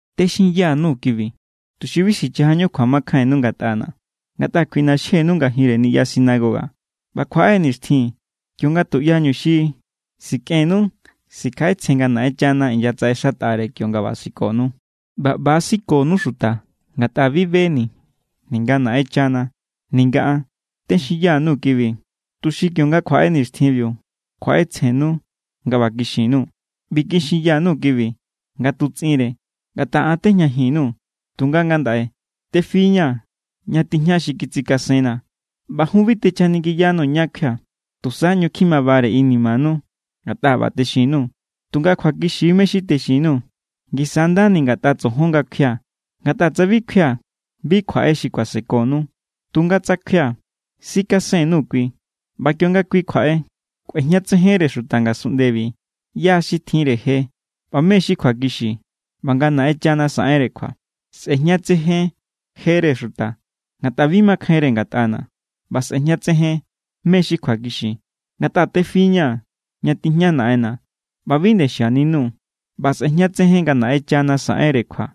’Texinya_nuu̱ kibi, tuxi bi sichajañu kjuamakjainnu ngatꞌana̱. Ngatꞌa kjuiꞌnaxjenu ngajinre niꞌya sinagoga. ꞌBa kjuaꞌe= nixtjin kionga tuꞌyañu xi sikꞌennu sikjaꞌetsjen nga Naꞌenchana inyatsaꞌexatꞌare kionga ꞌba sikonu. ꞌBa ꞌba sikonu xuta ngatꞌa bi beni̱, ninga Naꞌenchana ninga an. Texinya_nuu̱ kibi, tuxi kionga kjuaꞌe nixtjinbiu, kjuaꞌetsjenu nga ꞌba kixin_nuu̱. ’Bi kixinya_nuu̱ kibi nga tutsꞌinre, ngatꞌa an tejñajin_nuu̱. Tunga ngandaꞌe tefi=ña̱ ña tijña xi kitsikasenna̱, ꞌba jun bi techjaningiyanuu̱ ñá kjuia̱. Tusa ꞌñu kjimabare inimanu ngatꞌa ꞌba= texin_nuu̱. Tunga kjuakixi= mé= xi texin_nuu̱. Ngisa= ndani ngatꞌa tsojon nga kjuia̱. Ngatꞌa tsa bi kjuia̱, bi kjuaꞌe xi kuasekonu. Tunga tsa kjuia̱, sikasen_nuu̱ kui. ꞌBa kionga kui kjuaꞌe, kꞌuejñatsejenre xuta ngasunꞌndebi ꞌyá= xi tjinre je ꞌba mé= xi kjuakixi ꞌba nga Naꞌenchana saꞌenre kjua. Sꞌe̱jñatsejen jere xuta, ngatꞌa bi makjainre ngatꞌana̱. ꞌBa sꞌe̱jñatsejen mé= xi kjuakixi, ngatꞌa tefi=ña̱ ña tijña Naꞌenna̱ ꞌba bi nde xianinuu̱. ꞌBa sꞌe̱jñatsejen nga Naꞌenchana saꞌenre kjua,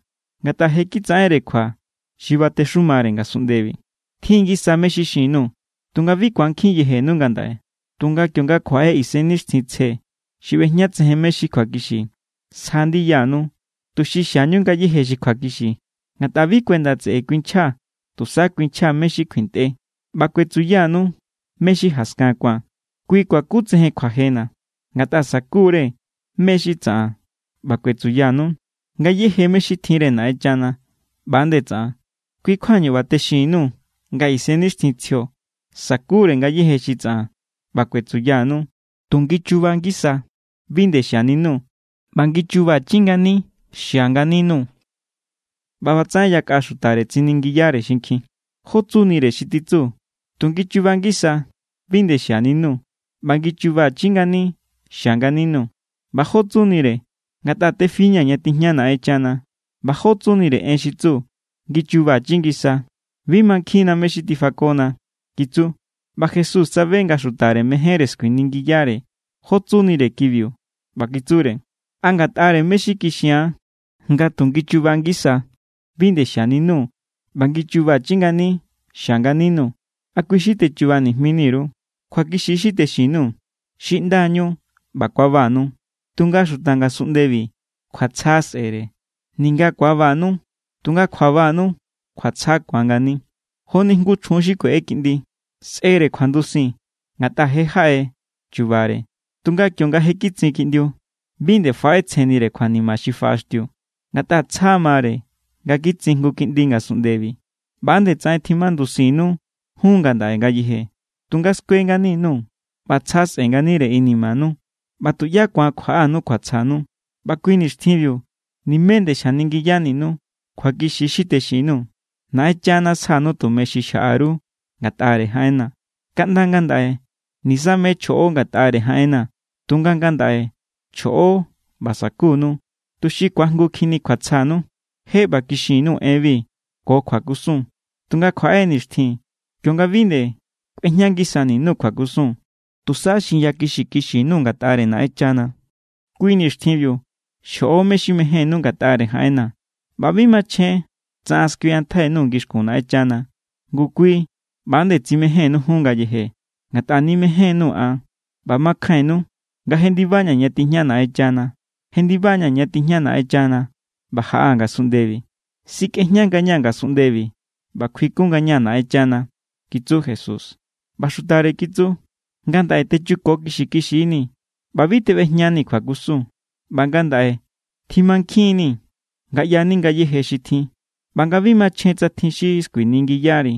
ngatꞌa je kitsaꞌenre kjua xi batexumare ngasunꞌndebi. ’Tjin= ngisana̱ mé= xi xin_nuu̱, tunga bi ku̱ankjin yejenu ngandaꞌe. Tunga kionga kjuaꞌe Isennixtjintsje xi ꞌbejñatsejen mé= xi kjuakixi, sja ndiyanu, tuxi xiañu ngayéje xi kjuakixi. Ngatꞌa bi kuenda tseꞌe kuinchja, tusa kuinchja mé= xi kjuintꞌe. ꞌBa kuetsuyanu mé= xi jaskan ku̱an. Kui kuakutsejen kjuajena̱, ngatꞌa sa̱ku=re mé= xi tsaꞌan ꞌba kuetsuyanu. Ngayéje mé= xi tjinre Naꞌenchana, ꞌba=nde tsaꞌan. Kui= kjuañu ꞌba texinni_nuu̱ nga Isennixtjintsjio sa̱kure ngayéje xi tsaꞌan ꞌba kuetsuyanu. Tu ngichuba ngisa bi nde xianinuu̱, ꞌba ngichubachi ngani xia nganinuu̱. ꞌBa ꞌbatsaꞌen yakꞌa xutare tsiningiyare xinkjin: —¿Jó tsunire xi titsu: “Tu ngichuba ngisa bi nde xianinuu̱ ꞌba ngichubachi ngani xia nganinuu̱”? ¿ꞌBa jó tsunire: “Ngatꞌa tefi=ña̱ ña tijña Naꞌenchana”? ꞌBa ¿jó tsunire en xi tsu: “ngichuba ngisa”? Bi mankjinna mé= xi tifakona —kitsu. ꞌBa Jesús tsabe nga xutare mejénre skuiningiyare jó tsunire kibiu ꞌba kitsure: —¿A ngatꞌare mé= xi kixia̱n, nga tu ngichuba ngisa bi nde xianinuu̱ ꞌba ngichubachi ngani xia nganinuu̱, a kui= xi techuba nijmini_ru? Kjuakixi= xi texin_nuu̱. Xiꞌndañu ꞌba ku̱abanu, tunga xuta ngasunꞌndebi kjuatsja sꞌe̱re. Ninga ku̱abanu, tunga kjuabanu kjuatsja ku̱an ngani. Joni jngu chjun xi kueꞌe kiꞌndi. Sꞌere kjuandusin, ngatꞌa je jaꞌe chubare. Tunga kionga je kitsin kiꞌndiu, bi nde faꞌetsjennire kjuanima xi kafaꞌaxtiu, ngatꞌa tsja mare nga kitsin jngu kiꞌndi ngasunꞌndebi. ꞌBa nde tsaꞌen tjimandusinnu jun ngandaꞌe ngayeje, tunga skue ngani_nuu̱ ꞌba tsja sꞌe̱ nganire inimanu. ꞌBa tuꞌyá ku̱an kjuaꞌanu kjuatsjanu. ’ꞌBa kui nixtjinbiu nimé nde xjaningiyaninuu̱. Kjuakixi= xi texin_nuu̱. Naꞌenchana sjanu tumeñu xi xjaꞌa_ru ngatꞌare jaꞌenna̱. Kaꞌnda ngandaꞌe nisamé chjoꞌo ngatꞌare jaꞌenna̱. Tunga ngandaꞌe chjoꞌo ꞌba sa̱kunu, tuxi ku̱aajngukjinni kjuatsjanu. ’Je ꞌba kixin_nuu̱ enbi ko kjuakusun, tunga kjuaꞌe= nixtjin kionga bi nde kꞌuejña ngisani_nuu̱ kjuakusun. Tusa xinyakixi kixi_nuu̱ ngatꞌare Naꞌenchana. Kui nixtjinbiu xjoꞌo mé= xi mejénnú ngatꞌare jaꞌenna̱, ꞌba bi machjen tsa an skuiꞌantjai_nuu̱ ngixkun Naꞌenchana. Ngu kui ꞌba=nde tsimejénnu jun ngayeje, ngatꞌa nimejénnuu̱ an ꞌba makjainnu nga jendibaña̱ ña tijña Naꞌenchana. Jendiba=ña̱ ña tijña Naꞌenchana ꞌba jaꞌaa̱ ngasunꞌndebi. Sikꞌejña ngañaa̱ ngasunꞌndebi ꞌba kjuikun ngañaa̱ Naꞌenchana —kitsu Jesús. ꞌBa xutare kitsu: —Ngandaꞌe techuko kixi kixinii̱ ꞌba bi teꞌbejñanii̱ kjuakusun. ꞌBa ngandaꞌe tjimankjin=ni̱ nga ꞌyani ngayéje xi tjin, ꞌba nga bi machjen tsa tjin xi skuiningiyari.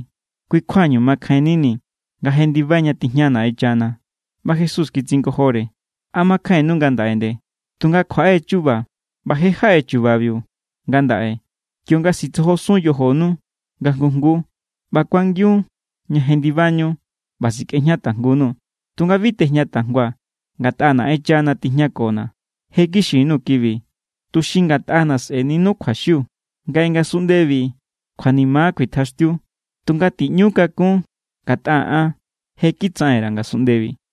Kui= kjuañu makjainnini̱ nga jendibai ña tijña Naꞌenchana. ꞌBa Jesús kitsingojore: —¿A makjainnu ngandaꞌe nde? Tunga kjuaꞌe= chuba ꞌba je= jaꞌe chubabiu ngandaꞌe kionga sitsojosun yojonu nga jngu jngu. ꞌBa kuangiun ña jendibañu ꞌba sikꞌejña tajngunuu̱. Tunga bi tejña tajngua̱, ngatꞌa Naꞌenchana tijñakona̱. Je kixin_nuu̱ kibi, tuxi ngatꞌana̱ sꞌe̱ninu kjuaxiu. Ngaꞌe ngasunꞌndebi kjuanima kuitjaxtiu, tunga tiꞌñu kakún ngatꞌa an je= kitsaꞌen_ra̱ ngasunꞌndebi.